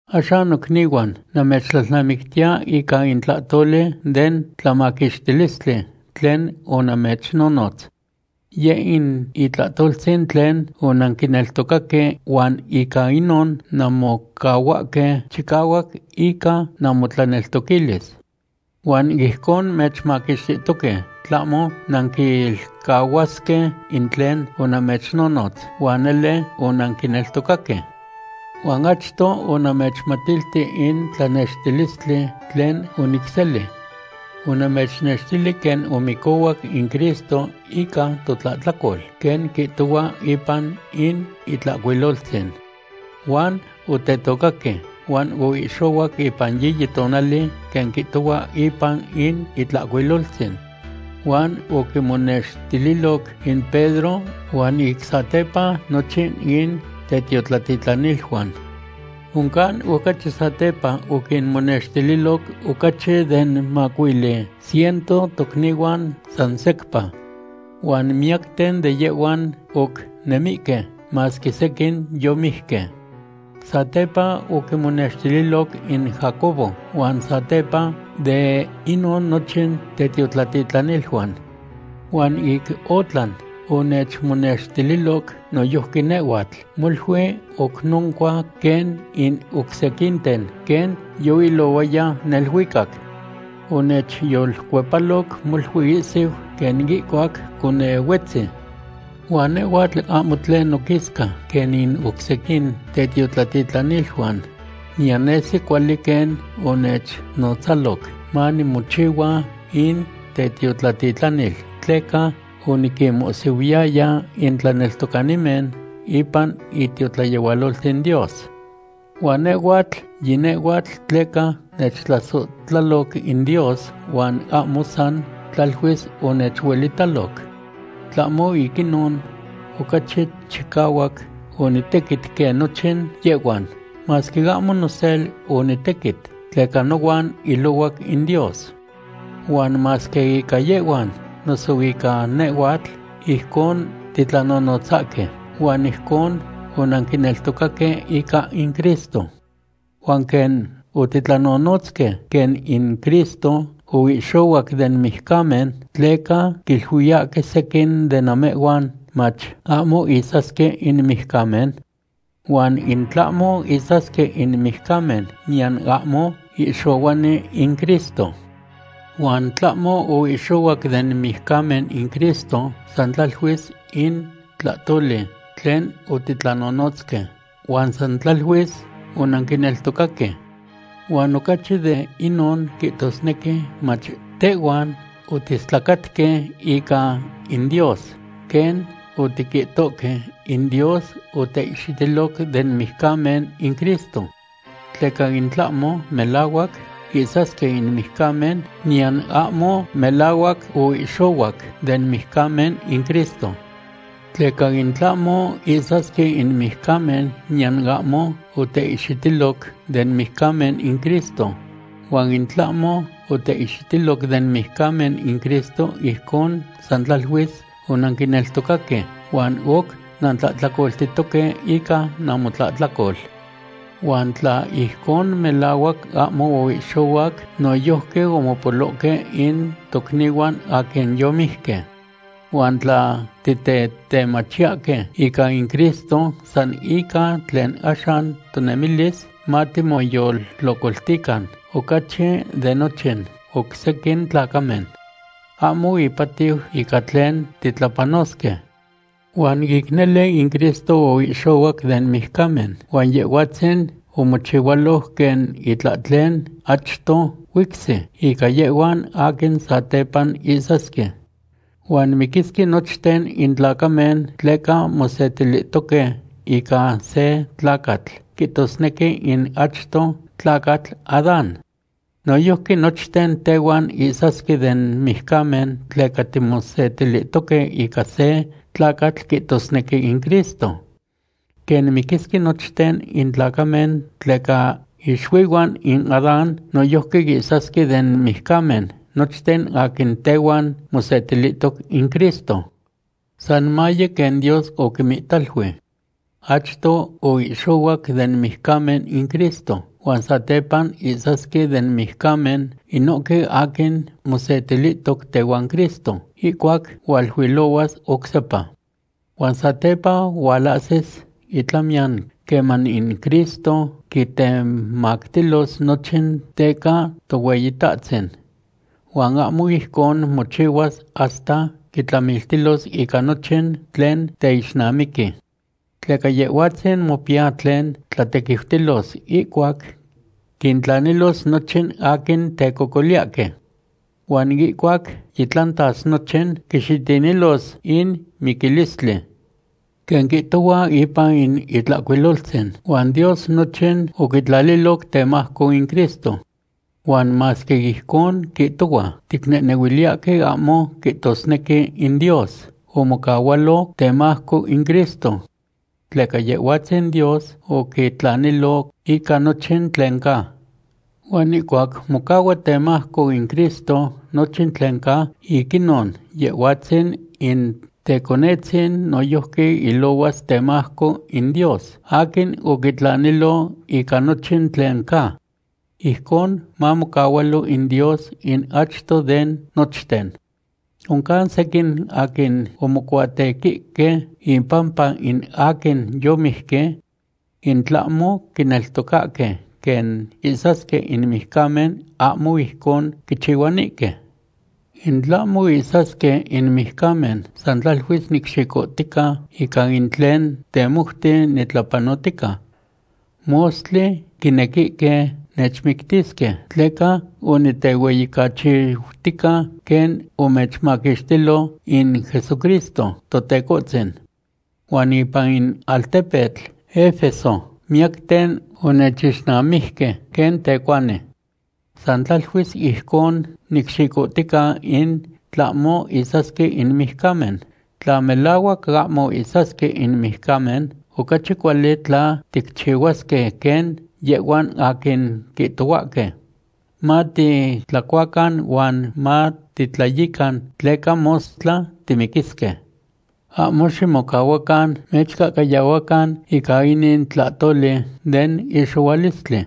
Axan nocnihuan, namechtlalnamictiya ica in tlahtoli den tlamaquixtilistli tlen onamechnonotz. Yeh in itlahtoltzin tlen onanquineltocaque huan ica inon nanmocahuahque chicahuac ica namotlaneltoquilis. Huan ijcon mechmaquixtihtoque tlahmo nanquilcahuasque in tlen onamechnonotz, huan nele onanquineltocaque. Huan achto onamechmatilti in tlanextilistli tlen onicseli. Onamechnextili quen omicohuac in Cristo ica totlahtlacol, quen quihtohua ipan in Itlahcuiloltzin. Huan otetocaque, huan oihxohuac ipan yiyi tonali, quen quihtohua ipan in Itlahcuiloltzin. Huan oquimonextililoc in Pedro huan ic satepa nochin in tetiotlatitlaniluan. Oncan ocachi satepa oquinmonextililoc ocachi den macuili ciento tocnihuan san secpa. Huan miyacten de yehhuan oc nemihque, masque sequin yomijque. Satepa oquimonextililoc in Jacobo huan satepa de inon nochin tetiotlatitlaniluan. Huan ic otlan, onechmonextililoc noyojqui nehhuatl, molui oc noncua quen in oc sequinten, quen yoilohuaya neluicac. Onechyolcuepaloc molui ihsiu quen ihcuac conehuetzi. Huan nehhuatl ahmo tlen noquisca quen in oc sequin tetiotlatitlaniluan. Niyan nesi cuali quen onechnotzaloc manimochihua in tetiotlatitlanil, tleca oniquinmohsihuiyaya in tlaneltocanimen ipan itiotlayehualoltzin Dios. Huan nehhuatl yinehhuatl tleca nechtlasohtlaloc in Dios huan ahmo san tlaluis onechuelitaloc. Tlahmo ic inon, ocachi chicahuac onitequit quen nochin yehhuan, masque ahmo nosel onitequit, tleca nohuan ilohuac in Dios. Huan masque ica yehhuan noso ica nehhuatl ijcon titlanonotzahque, huan ijcon onanquineltocaque ica in Cristo. Huan quen otitlanonotzque quen in Cristo oihxohuac den mijcamen, ¿tleca quiluiyahque sequin de namehhuan mach, ahmo ihsasque in mijcamen? Huan in tlahmo ihsasque in mijcamen, niyan ahmo ihxohuani in Cristo. Huan tlahmo oihxohuac den mijcamen in Cristo, san tlaluis in tlahtoli tlen otitlanonotzque, huan san tlaluis onanquineltocaque. Huan ocachi de inon quihtosnequi mach tehhuan otiistlacatque ica in Dios, quen otiquihtohque in Dios oteihxitiloc den mijcamen in Cristo. Tleca in tlahmo melahuac ihsasque in mijcamen, niyan ahmo melahuac oihxohuac den mijcamen in Cristo. Tleca in tlahmo ihsasque in mijcamen niyan ahmo oteihxitiloc den mijcamen in Cristo. Huan in tlahmo oteihxitiloc den mijcamen in Cristo, ijcon san tlaluis onanquineltocaque huan oc nantlahtlacoltihtoque ica namotlahtlacol. Huan tla ijcon melahuac ahmo oihxohuac, noyojqui omopolohque in tocnihuan aquin yomijque. Huan tla titetemachiyahque ica in Cristo san ica tlen axan tonemilis, matimoyoltlocoltican ocachi de nochin oc sequin tlacamen. Ahmo ipatiu ica tlen titlapanosque. Huan ic nele, in Cristo oihxohuac den mijcamen, huan Yehhuatzin omochihualoc quen itlahtlen achto huicsi ica yehhuan aquin satepa ihsasque. Huan miquisque nochten in tlacamen tleca mosetilihtoque ica se tlacatl quihtosnequi in achto tlacatl Adán. Noyojqui nochten tehhuan ihsasque den mijcamen tleca timosetilihtoque ica se tlacatl quihtosnequi in Cristo. Quen miquisque nochten in tlacamen tleca ixuihuan in Adán, noyojqui ihsasque den mijcamen nochten aquin tehuan mosetilihtoc in Cristo. San maye quen Dios oquimihtalui. Achto oihxohuac den mijcamen in Cristo huan satepa ihsasque den mijcamen inohque aquin mosetilihtoc tehuan Cristo ihcuac hualuilohuas oc sepa. Huan satepa hualahsis itlamiyan queman in Cristo quitemactilos nochin teca Tohueyitahtzin. Huan ahmo ijcon mochihuas hasta quitlamiltilos ica nochin tlen teixnamiqui. Tleca Yehhuatzin mopiya tlen tlatequiutilos ihcuac quintlanilos nochin aquin tecocoliyahque. Huan ihcuac yitlantas nochin, quixitinilos in miquilistli. Quen quihtohua ipan in Itlahcuiloltzin: “Huan Dios nochin oquitlaliloc temajco in Cristo.” Huan masque ijcon quihtohua, ticnehnehuiliyahque ahmo quihtosnequi in Dios omocahualo temajco in Cristo. Tleca Yehhuatzin Dios oquitlanilo ica nochin tlen ca. Huan ihcuac mocahua temajco in Cristo nochin tlen ca, ic inon Yehhuatzin in Teconetzin noyojqui ilohuas temajco in Dios aquin oquitlanilo ica nochin tlen ca. Ijcon mamocahualo in Dios in achto de nochten. Oncan sequin aquin omocuatequihque impampa in aquin yomijque. In tlahmo oquineltocaque quen ihsasque in mijcamen, ahmo ijcon quichihuanihque. In tlahmo ihsasque in mijcamen, san tlaluis nicxicohtica ica in tlen temouti nitlapanotica. Mostli quinequihque nechmictisque tleca onitehueyicachiutica quen omechmaquixtilo in Jesucristo Totecohtzin. Huan ipan in altepetl Efeso miyacten onechixnamijque quen tecuani. San tlaluis ijcon nicxicohtica in tlahmo ihsasque in mijcamen. Tla melahuac ahmo ihsasque in mijcamen, ocachi cuali tla ticchihuasque quen yehhuan aquin quihtohuahque: “Matitlacuacan huan matitlayican, tleca mostla timiquisque.” Ahmo ximocahuacan mechcahcayahuacan ica inin tlahtoli den ihxohualistli.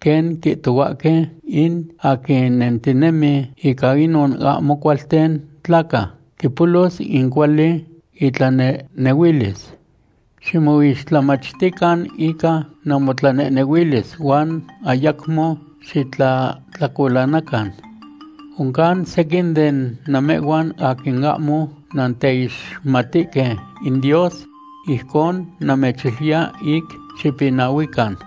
Quen quihtohuahque: “In aquin nentinemi ica inon ahmo cualten tlaca quipolos in cuali itlanehnehuilis.” Ximoixtlamachtican ica namotlanehnehuilis huan ayacmo xitlahtlacolanacan. Oncan sequin de namehhuan aquin ahmo nanteixmatihque in Dios. Ijcon namechiluiya ic xipinahuican.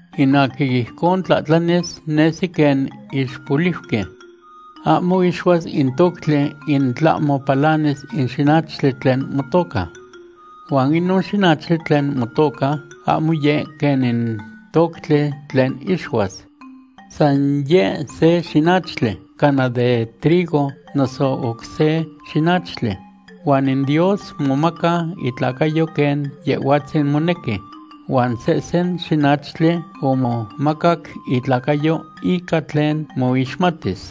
In aquin ijcon tlahtlanis nesi quen ixpoliuqui. Ahmo ixuas in toctli in tlahmo palanis in xinachtli tlen motoca. Huan inon xinachtli tlen motoca ahmo yeh quen in toctli tlen ixuas. San yeh se xinachtli cana de trigo noso oc se xinachtli. Huan in Dios momaca itlacayo quen Yehhuatzin monequi. Huan sehsen xinachtli omomacac itlacayo ica tlen moixmatis.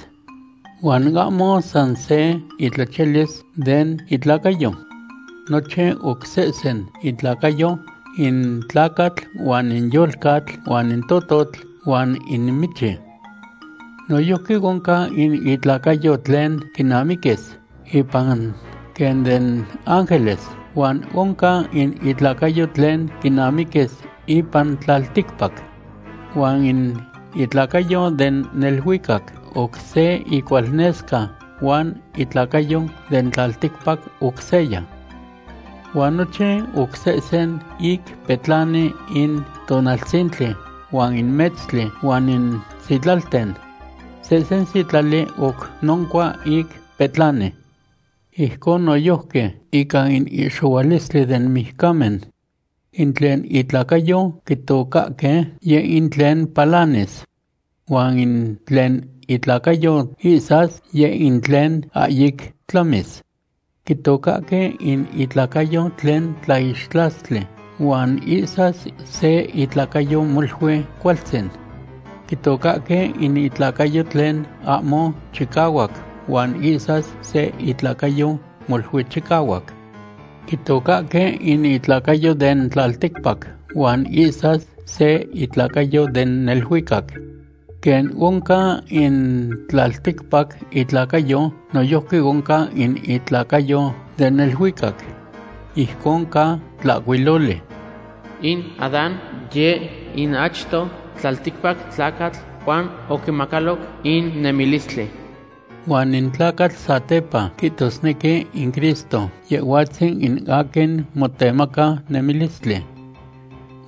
Huan ahmo san se itlachiyalis den itlacayo. Nochin oc sehsen intlacacayo in tlacatl huan in yolcatl huan in tototl huan in michi. Noyojqui oncan in itlacayo tlen quinamiquis ipan quen den ángeles, huan oncan in itlacayo tlen quinamiquis ipan tlalticpac. Huan in itlacayo den neluicac oc se icualnesca huan itlacayo den tlalticpac oc seya. Huan nochin oc sesehse ic petlani in tonaltzintli huan in metztli, huan in sitlalten. Sehsen sitlali oc noncua ic petlani. Ijcon noyojqui ica in ihxohualistli den mijcamen. In tlen itlacayo quitocahque, yeh in tlen palanis. Huan in tlen itlacayo ihsas, yeh in tlen ahyic tlamis. Quitocahque in itlacayo tlen tlaixtlastli huan ihsas se itlacayo molui cualtzin. Quitocahque in itlacayo tlen ahmo chicahuac huan ihsas se itlacayo molui chicahuac. Quitocahque in itlacayo den tlalticpac huan ihsas se itlacayo den neluicac. Quen oncan in tlalticpac itlacayo, noyojqui oncan in itlacayo den neluicac. Ijcon ca tlahcuiloli: “In Adán, yeh in achto tlalticpac tlacatl, huan oquimacaloc in nemilistli.” Huan in tlacatl satepa, quihtosnequi in Cristo, Yehhuatzin in aquin motemaca nemistlistli.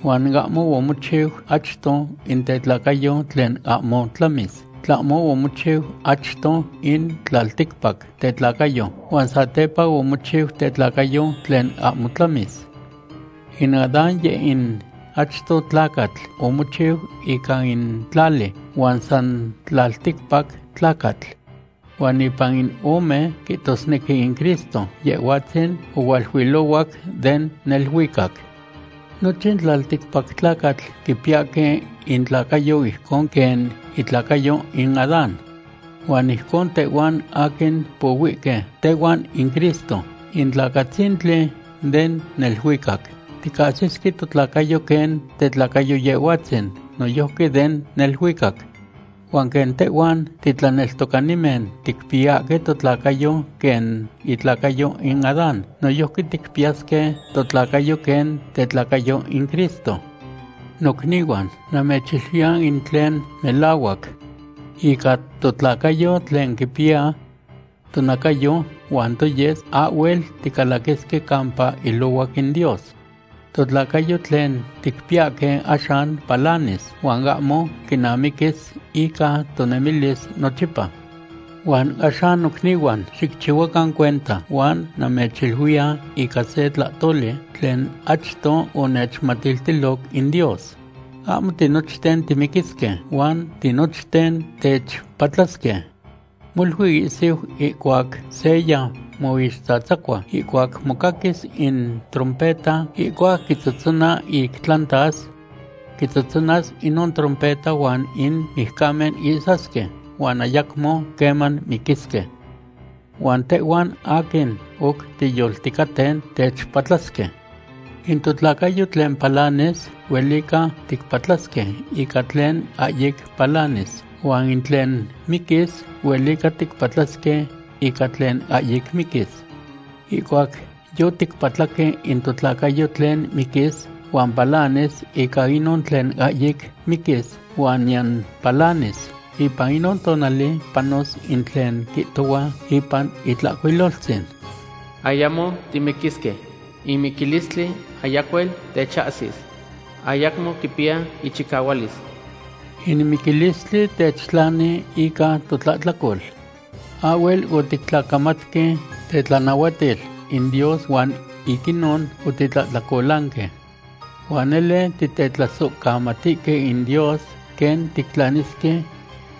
Huan ahmo omochiu achto in tetlacayo tlen ahmo tlamis, tlamo omochiu achto in tlalticpac tetlacayo, huan satepa omochiu tetlacayo tlen ahmo tlamis. In Adán, yeh in achto tlacatl, omochiu ica in tlali, huan san tlalticpac tlacatl. Huan ipan in ome, quihtosnequi in Cristo, Yehhuatzin ohualuilohuac den neluicac. Nochin tlalticpac tlacatl quipiyahque intlacayo ijcon quen itlacayo in Adán. Huan ijcon tehhuan aquin pohuihque tehuan in Cristo, in tlacatzintli den neluicac, ticahsisque totlacayo quen tetlacayo Yehhuatzin, noyojqui den neluicac. Huan quen tehhuan titlaneltocanimen ticpiyahque totlacayo quen itlacayo in Adán, noyojqui ticpiyasque totlacayo quen tetlacayo in Cristo. Nocnihuan, namechiluiya in tlen melahuac. Ica totlacayo tlen quipiya tonacayo huan toyes, ahhuel ticalaquisque campa ilohuac in Dios. Totlacayo tlen ticpiyahque axan palanis huan ahmo quinamiquis ica tonemilis nochipa. Huan axan nocnihuan, xicchihuacan cuenta, huan namechiluiya ica se tlahtoli tlen achto onechmatiltiloc in Dios. Ahmo tinochten timiquisque, huan tinochten techpatlasque. Molui ihsiu, ihcuac seya moixtzatzacua, ihcuac mocaquis in trompeta ihcuac quitzotzona ic tlantas. Quitzotzonas inon trompeta huan in mijcamen ihsasque, huan ayacmo queman miquisque. Huan tehhuan aquin oc tiyolticaten, techpatlasque. In totlacayo tlen palanis, huelica ticpatlasque ica tlen ahyic palanis, huan in tlen miquis, huelica ticpatlasque ica tlen ahyic miquis. Ihcuac yoticpatlaque in totlacayo tlen miquis huan palanis ica inon tlen ahyic miquis huan niyan palanis, ipan inon tonali panos in tlen quihtohua ipan Itlahcuiloltzin: “Ayacmo timiquisque. In miquilistli ayacuel techahsis. Ayacmo quipiya ichicahualis.” In miquilistli techtlani ica totlahtlacol. Ahhuel otictlacamatque tetlanahuatil in Dios huan ic inon otitlahtlacolanque. Huan nele titetlasohcamatihque in Dios quen tictlanisque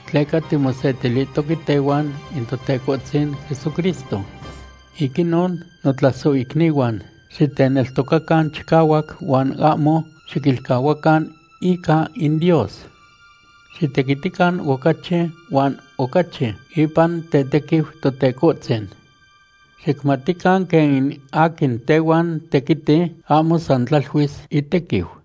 tleca timosetilihtoque tehuan in Totecohtzin Jesucristo. Ic inon, notlasohicnihuan, xiteneltocacan chicahuac huan ahmo xiquilcahuacan ica in Dios. Xitequitican ocachi huan ocachi ipan tetequiu Totecohtzin. Xicmatican quen in aquin tehuan tequiti, ahmo san tlaluis itequiu.